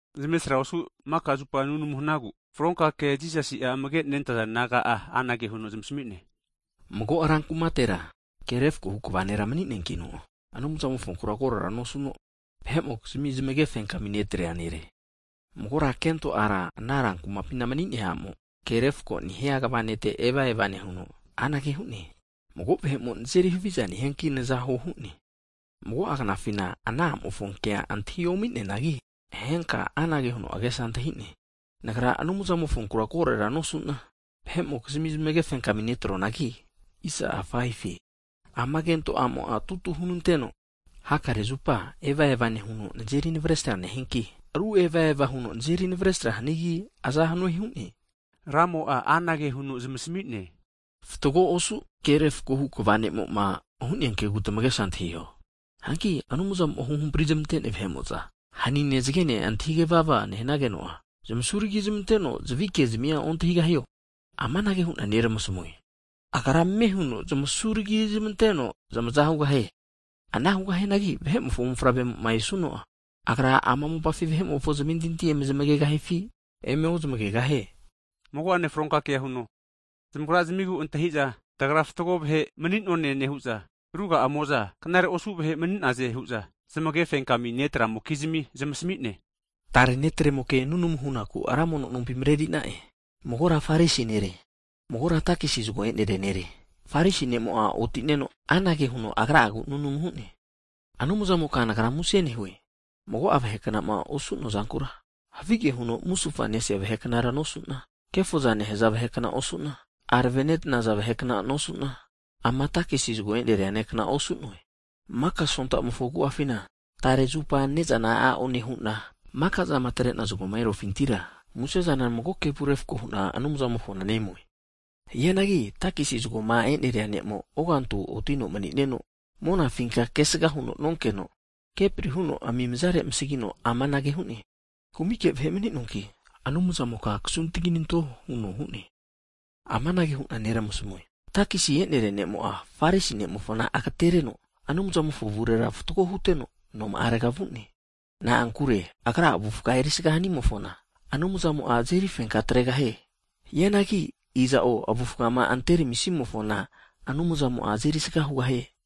Zmavesra osu maka zupa nunamu hanagu, fronka ke Jisasi'a amagema nentaza disaipol naga'a anage huno zmasamine. Mago rankumatera ke refkohu (jas) kva nera mni'neakino, Anumzamofonku korera nosuno, vahe'mokizmia zmagefenkami netrea nere. Magora kento ara ana rankumapina mni'nea amo, ke refko nehia kva nete eva eva nehuno, anage hu'ne. Mago vahe'mo nazeri haviza nehianki naza huo hu'ne. Mago'a knafina ana amofo kea antahi omi'neanagi, henka anage huno agesa antahine. Nagra Anumzamofonkura korera nosu'na, vahe'mokizmia zmagefenkami netroanagi, ama kento a'mo tutu hunenanteno hakare zupa evava nehuno nazeri navesra nehianki, ru evava huno nazeri naveresra hanigi aza hanue hu'ne. Ramo'a anage huno zamasmi'ne, fatgo osu ke refkohu kva nemo'ma hu'nea kegu tamagesa antahiho hu'ne. Hanki Anumzamo'ma huhampri zmantenea vahe'mo'za, hanine zgene antahigevava nehnageno'a, zmasuragizmanteno zavikezmia ontahigahio? Amanage hu'na neramasamue. Agra ame huno zmasu ragizmanteno zamaza hugahie. Ana hugahianagi Vahe'mofo Mofavre'moma esuno'a, Agra ama mopafi vahe'mofo zmentinti emezmagegahifi emeozamagegahie? Mago'ane fronka kea huno, zamagrazmigu antahi'za tagra fatgo vahe mani'none nehu'za, ruga'amo'za knare osu vahe mani'naze hu'za zmagefenkami netrazamokizmi zmasami'ne, tare netremoke nunamu hunaku ra mono nompi mreri'na'e. Magora Farisi nere, magora takisi zgo e'neria nere. Farisi ne'mo'a otineno anage huno agra'agu nunamu hu'ne. Anumzamoka nagra susus huna muse nehue, mago'a vaheknama osu'na havige huno musufa nesea vaheknara nosuna, kefoza nehaza vahekna osu'na, arave netanaza vahekna nosuna, ama takesi zgo eneria ne'kna osu'noe. Maka sontamofo agu'afina tare zupa nezana a'o nehuna, makazama atrena zgoma erufintira, musezana mago kevu refko huna Anumzamofona nemue. Hianagi takisi zgoma e'neria ne'mo ogantu otino manino monafinka kesga huno nonkeno, kepri huno amimizare amasagino amanage hu'ne. Kumike vahe mni'noanki Anumzamoka kasuntaginanto huno hu'ne! Amanage huna neramasamue, takisi eneria ne'mo'a Farisi ne'mofona agetereno Anumzamofo avurera fatgo huteno noma'arega vu'ne. Na'ankure agra avufga erisaga hanimofona, Anumzamo'a azeri fenka atregahie. Hianagi iza'o avufama anteramisimofona, Anumzamo'a azeri sga hugahie.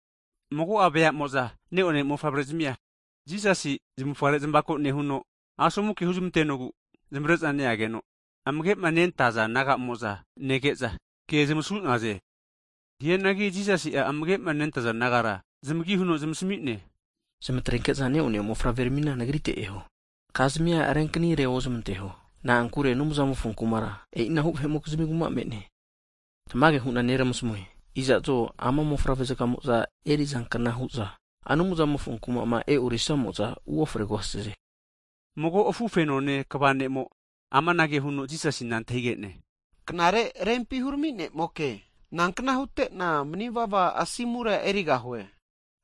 Mago'a veamo'za ne'one mofavre'zmia Jisasi zamufare zmavako nehuno, asomu ke huzmantenogu zmavre'za neageno, amage'ma nentaza disaipol nagamo'za nege'za, ke zmasu'naze. Hianagi Jisasi'a amagema nentaza disaipol nagara zmagi huno zamasmi'ne, zmatrenke'za ne'one mofavre ramina Nagrite eho. Kazmia renkanire ozmanteho. Na'ankure Anumzamofo Kumara, e'inahu vahe'mokizmi kuma me'ne. Tmage hu'na neramasmue, iza'zo ama mofavre'mo'za enerizankna hu'za Anumzamofo Kumama e'orisamo'za, uofregahaze. Mago afufenone kva ne'mo amanage huno Jisasina antahige'ne, Knare Rempi Hurami Ne'moke, nankna hutena manivava asimura erigahue?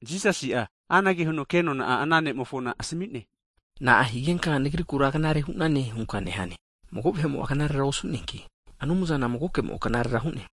Jisasi'a anage huno kenona ana nemofona asmi'ne. Na'a higenka Nagrikura knare hunane hunka nehane? Mago vahe'mo'a knarera osu'neanki, Anumzana magokemo knarera hu'ne.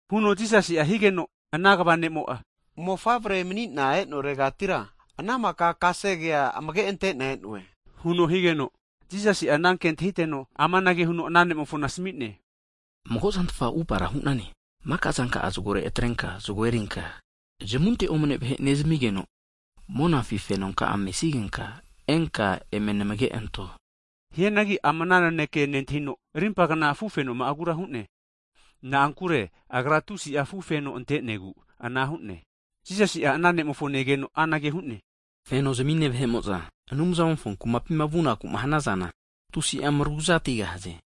Huno Jisasi'a higeno, ana kva ne'mo'a mofavre mani'na enoregatira ana mika kesegea amage ante'na e'noe, huno higeno, Jisasi' ana ke antahiteno amanage huno ana ne'mofona asmi'ne, mago zantfa atupara hu'nane, maka zanka'a zgore atrenka zgo erinka, zamunte omne vahe nezamigeno, monafi fenonka'a mesigenka enka eme namage anto. Hianagi ama ana naneke nentahino, rimpagna afufenoma'agura hu'ne. Na'ankure agra tusi'a afufeno antenegu ana hu'ne. Jisasi'a ana nemofo negeno anage hu'ne, fenozmine vahe'mo'za Anumzamofo Kumapima vunaku'ma hanazana tusi'a mraguzatigahaze!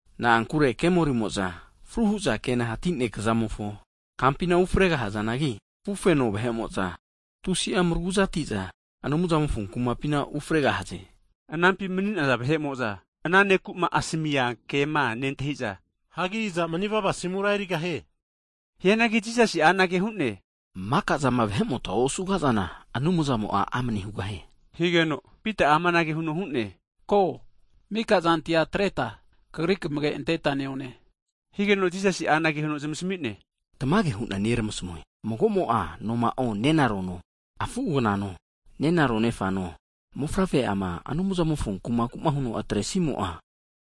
Na'ankure kemorimo'za fru hu'za kena hati nekazamofo kampina ufregahazanagi, afufenone vahe'mo'za tusi'a mraguzati'za Anumzamofo Kumapina ufregahaze. Anampi mni'naza vahe'mo'za ana ne'kuma asamia kema nentahiza, hagi iza manivava asimura erigahie hu'za antahigenaze? Hianagi Jisasi'a anage hu'ne, makazama vahe'mota osugazana, Anumzamo'a amne hugahie higeno, Pita'a amanage huno hu'ne. Ko, mika zantia atreta, Kagri kamage anteta neone. Higeno Jisasi'a anage huno zmasami'ne, tamage hu'na neramasamue, magomo'a noma'o nenarono, afu aganano, nererano nefano, mofavre'ama Anumzamofo Kumaku'ma huno atresimo'a,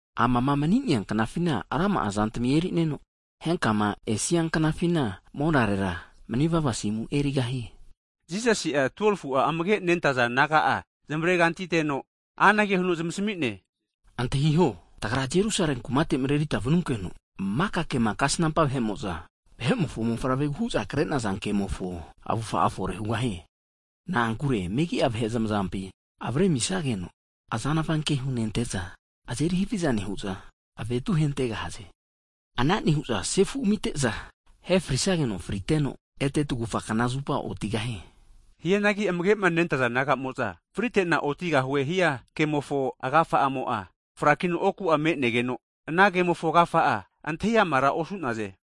amama mni'nea knafina rama'azantmi e'nerino, henkama esia knafina monarera, manivava asimura erigahie. Jisasi'a 12fu'a amage'nentaza disaipol naga'a zmavrekanti anteno, anage huno zmasami'ne, antahiho, Tagra Jerusale kumate marerita vanunkeno, maka kema kasnampa vahe'mo'za, Vahe'mofo Mofavregu hu'za kre'naza kemofo avufa'a fore hugahie. Na'ankure megi'a vahe zmazampi avare amisageno, azanva ke hunente'za, azeri haviza nehu'za, avetu ahentegahaze. Ana nehu'za, sefu amite'za, ahefrisageno friteno, ete tagufa knazupa otigahie. Hianagi amage'ma nentaza disaipol nagamo'za fritena otigahue hiankemofo agafa'amo'a frakino oku'a me'negeno, ana kemofo agafa'a antahi amara osu'naze.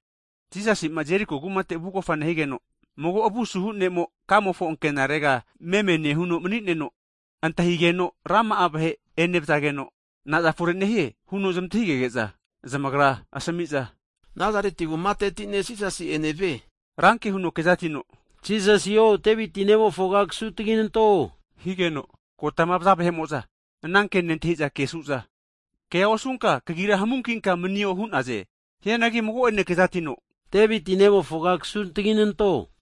Jisasi'ma Jeriko kumate vugofa nehigeno, mago avusuhu ne'mo kamofo ankenarega meme nehuno mni'neno, antahigeno rama'a vahe enevzageno, naza fore nehie? huno zmantahigege'za, zamagra asmi'za, Nazareti kumateti ne' Jisasi enevie nehazageno, Ranke huno kezatino, Jisasio Deviti Nemofoga kasuntginanto! Higeno, kotama vaza vahe'mo'za ana ke nentahi'za kesu'za, kea osunka kagira hamunkinka manio hu'naze. Hianagi mago'ane kezatino, Deviti Nemofoga kasuntginanto!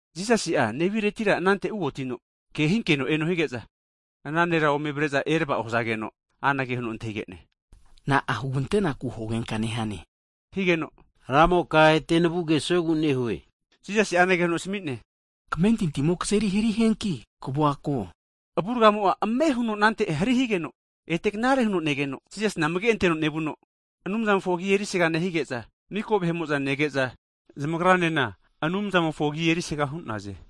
Jisasi'a neviretira anante uotino, kehinkeno eno hige'za, ana nera ome avare'za erava'o hazageno, anage huno antahige'ne. Na'a huganteku hugenka nehane? Higeno, Ramoka ete navua kesuegu nehue! Jisasi'a anage huno asmi'ne. Kamentintimo kazeri hari hianki kavua ko higeno, avurgamo'a ame huno anante hari higeno, ete knare huno negeno, Jisasina amage'anteno nevuno, Anumzamofo agi erisaga nehige'za, miko vahe'mo'za nege'za zamagranena Anumzamofo agi erisaga hu'naze.